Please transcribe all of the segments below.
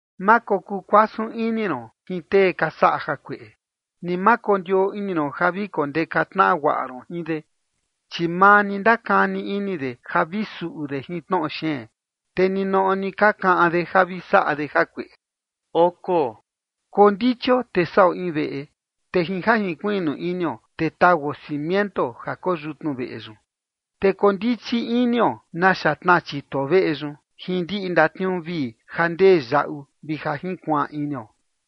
Ma kokuu kuasun ini ron jin tee ka saꞌa jakueꞌe, ni ma kondioo ini ron ja vi kondeka tnaꞌa guaꞌa ron jin de. Chi maa ni ka ndakani ini de ja vi suꞌu de jin tnoꞌo xeen, te ninoꞌo ni ka kaꞌan de ja vi saꞌa de jakueꞌe. Kondichio te saꞌo in veꞌe, te jin ja jinkuiꞌnu inio, te tauo cimiento ja koo yutnu veꞌe yun. Te kondichi inio naxa tnaa chituo veꞌe yun jin ndiꞌi ndatniuu vii ja ndee yaꞌu vi ja junkuaan inio.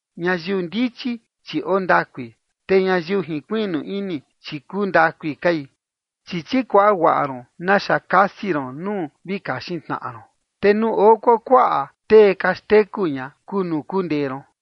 Ñayiu ndichi, chi ondakui, te ñayiu jinkuiꞌnu ini, chi kuu ndakui kai. Chi chikuaꞌa guaꞌa ron naxa kasi ron nuu vi kaxin tnaꞌa ron, te nuu oo kuakuaꞌa tee ka xteku ña kuu nuu kundee ron.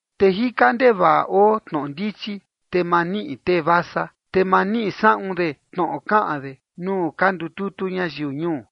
Te jika ndevaꞌa oo tnoꞌo ndichi, te ma niꞌi tee vasa, te ma niꞌi saꞌun de tnoꞌo kaꞌan de nuu ka ndututu ñayiu ñuu.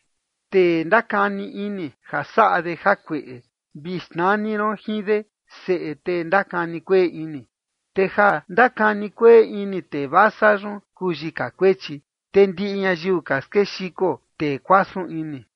Tee ndakani ini ja saꞌa de jakueꞌe, vi xnani ron jin de, “seꞌe tee ndakani kueꞌe ini”. Te ja ndakani kueꞌe ini tee vasa yun kuu yika kuechi, te ndiꞌi ñayiu ka skexiko tee kuasun ini.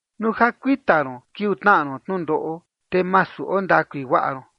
Nuu ja kuita ron kiuu tnaꞌa ron tnundoꞌo, te masu ondakui guaꞌa ron.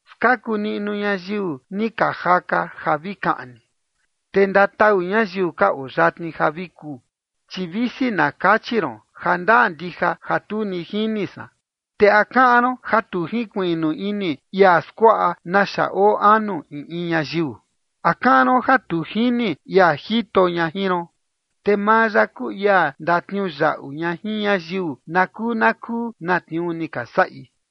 Skaku niꞌnu ñayiu ni ka jaka ja vi kaꞌni, te ndatau ñayiu ka oo yatni ja vi kuu. Chi visi na kachi ron: “Jandaa ndija ja tu ni jini san”, ¿te a kaꞌan ron ja tu jinkuiꞌnu ini ia skuaꞌa naxa oo anu in in ñayiu? ¿A kaꞌan ron ja tu jini ia jito ña jin ron? Te maa ya kuu ia ndatniuyaꞌu ña jin ñayiu na kuu na kuu na tniuu ni ka saꞌi.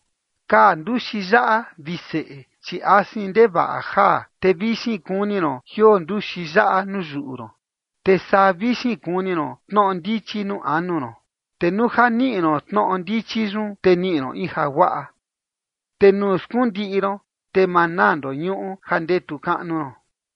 Kaa nduxi yaꞌa, vi seꞌe, chi asin ndevaꞌa jaa, te vixin kuni ron jioo nduxi yaꞌa nuu yuꞌu ron. Te saa vixin kuni ron tnoꞌo ndichi nuu anu ron, te nuu ja niꞌi ron tnoꞌo ndichi yun, te niꞌi ron in jaguaꞌa, te nuu skundiꞌi ron, te ma naa ndoñuꞌu ja ndetu kaꞌnu ron.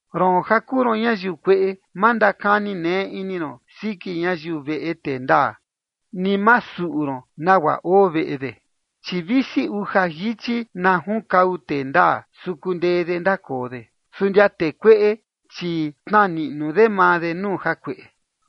Roon ja kuu ron ñayiu kueꞌe, ma ndakani neꞌe ini ron siki ñayiu veꞌe tee ndaa, ni ma suꞌu ron nagua oo veꞌe de. Chi visi uja jichi na junkau tee ndaa, su kundee de ndakoo de. Su ndia tee kueꞌe, chi tnaa niꞌnu de maa de nuu jakueꞌe.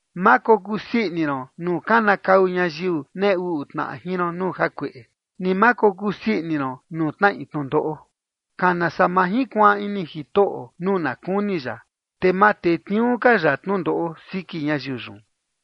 Ma kokuu sii ini ron nuu kanakau ñayiu nee uꞌu tnaꞌa jin ron nuu jakueꞌe, ni ma kokuu sii ini ron nuu tnaꞌi tnundoꞌo. Kana saa ma jinkuaan ini Jitoꞌo nuu na kuni ya, te ma tetniuu ka ya tnundoꞌo siki ñayiu yun.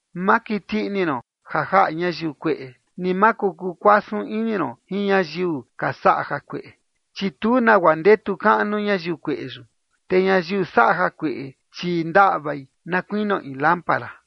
Ma kiti ini ron ja jaꞌa ñayiu kueꞌe, ni ma kokuu kuasun ini ron jin ñayiu ka saꞌa jakueꞌe. Chi tu nagua ndetu kaꞌnu ñayiu kueꞌe yun, te ñayiu saꞌa jakueꞌe, chi ndaꞌvai na kuinio in lámpara.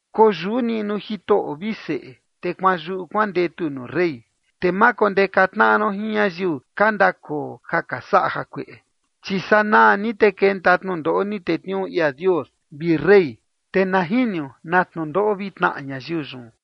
Koyuꞌu niꞌnu Jitoꞌo, vi seꞌe, te kuanyuꞌu kuandetu nuu rey, te ma kondeka tnaꞌa ron jin ñayiu ka ndakoo ja ka saꞌa jakueꞌe. Chi sanaa ni te kenta tnundoꞌo ni tetniuu ia Dios vi rey, te na jinio na tnundoꞌo vi tnaꞌa ñayiu yun.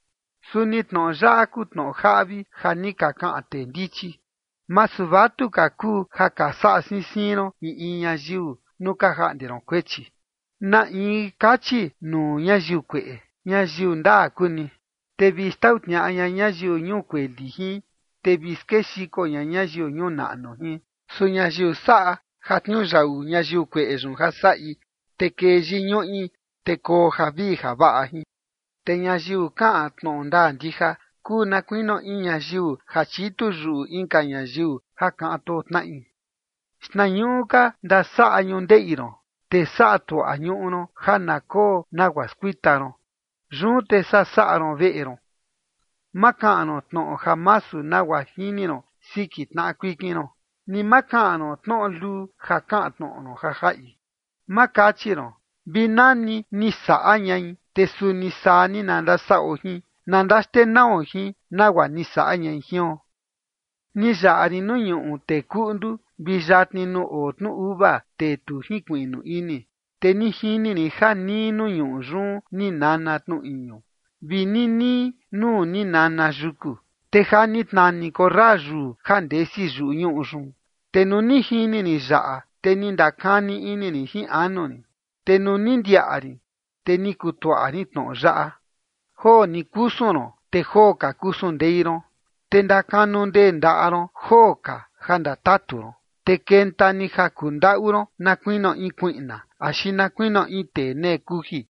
Suni tnoꞌo yaꞌa kuu tnoꞌo jaꞌvi ja ni ka kaꞌan tee ndichi: Masu vatuka kuu ja ka saꞌa siin siin ron in in ñayiu nuu ka jaꞌnde ron kuechi. Na in kachi nuu ñayiu kueꞌe: “Ñayiu ndaa kuu ni”, te vi xtau tniaꞌa ña ñayiu ñuu kueli jin, te vi skexiko ña ñayiu ñuu naꞌnu jin. Su ñayiu saꞌa ja tniuyaꞌu ñayiu kueꞌe yun ja saꞌi, te kee yiñuꞌi, te koo javii javaꞌa jin. Te ñayiu kaꞌan tnoꞌo ndaa ndija kuu na kuinio in ñayiu ja chitu yuꞌu inka ñayiu ja kaꞌan too tnaꞌi. Xtnañuꞌu ka ndasaꞌa ñundeꞌi ron, te saꞌa tuaꞌa ñuꞌu ron ja na koo nagua skuita ron, yun te saa saꞌa ron veꞌe ron. Ma kaꞌan ron tnoꞌo ja masu nagua jini ron siki tnaꞌa kuikin ron, ni ma kaꞌan ron tnoꞌo luu ja kaꞌan tnoꞌo ron ja jaꞌi. Ma kachi ron: “Vi nani ni saꞌa ñai, te suni saa ni na ndasaꞌo jin, na ndaxtenao jin, nagua ni saꞌa ñai jion”. Ni yaꞌa rin nuu ñuꞌu tee kuꞌndu, vi yatni nuu oo tnu uva tee tu jinkuiꞌnu ini. Te ni jini rin ja nii nuu ñuꞌu yun ni nana tnu iñu, vi ninii nuu ni nana yuku, te ja ni tnani korra yuu ja ndesi yuꞌu ñuꞌu yun. Te nuu ni jini rin yaꞌa, te ni ndakani ini rin jin anu rin, te nuu ni ndiaꞌa rin, te ni kutuaꞌa rin tnoꞌo yaꞌa: Joo ni kusun ron, te joo ka kusun ndei ron, te ndakanu ndee ndaꞌa ron joo ka ja ndatatu ron, te kenta ni ja kundaꞌu ron na kuinio in kuiꞌna, axi na kuinio in tee nee kuji.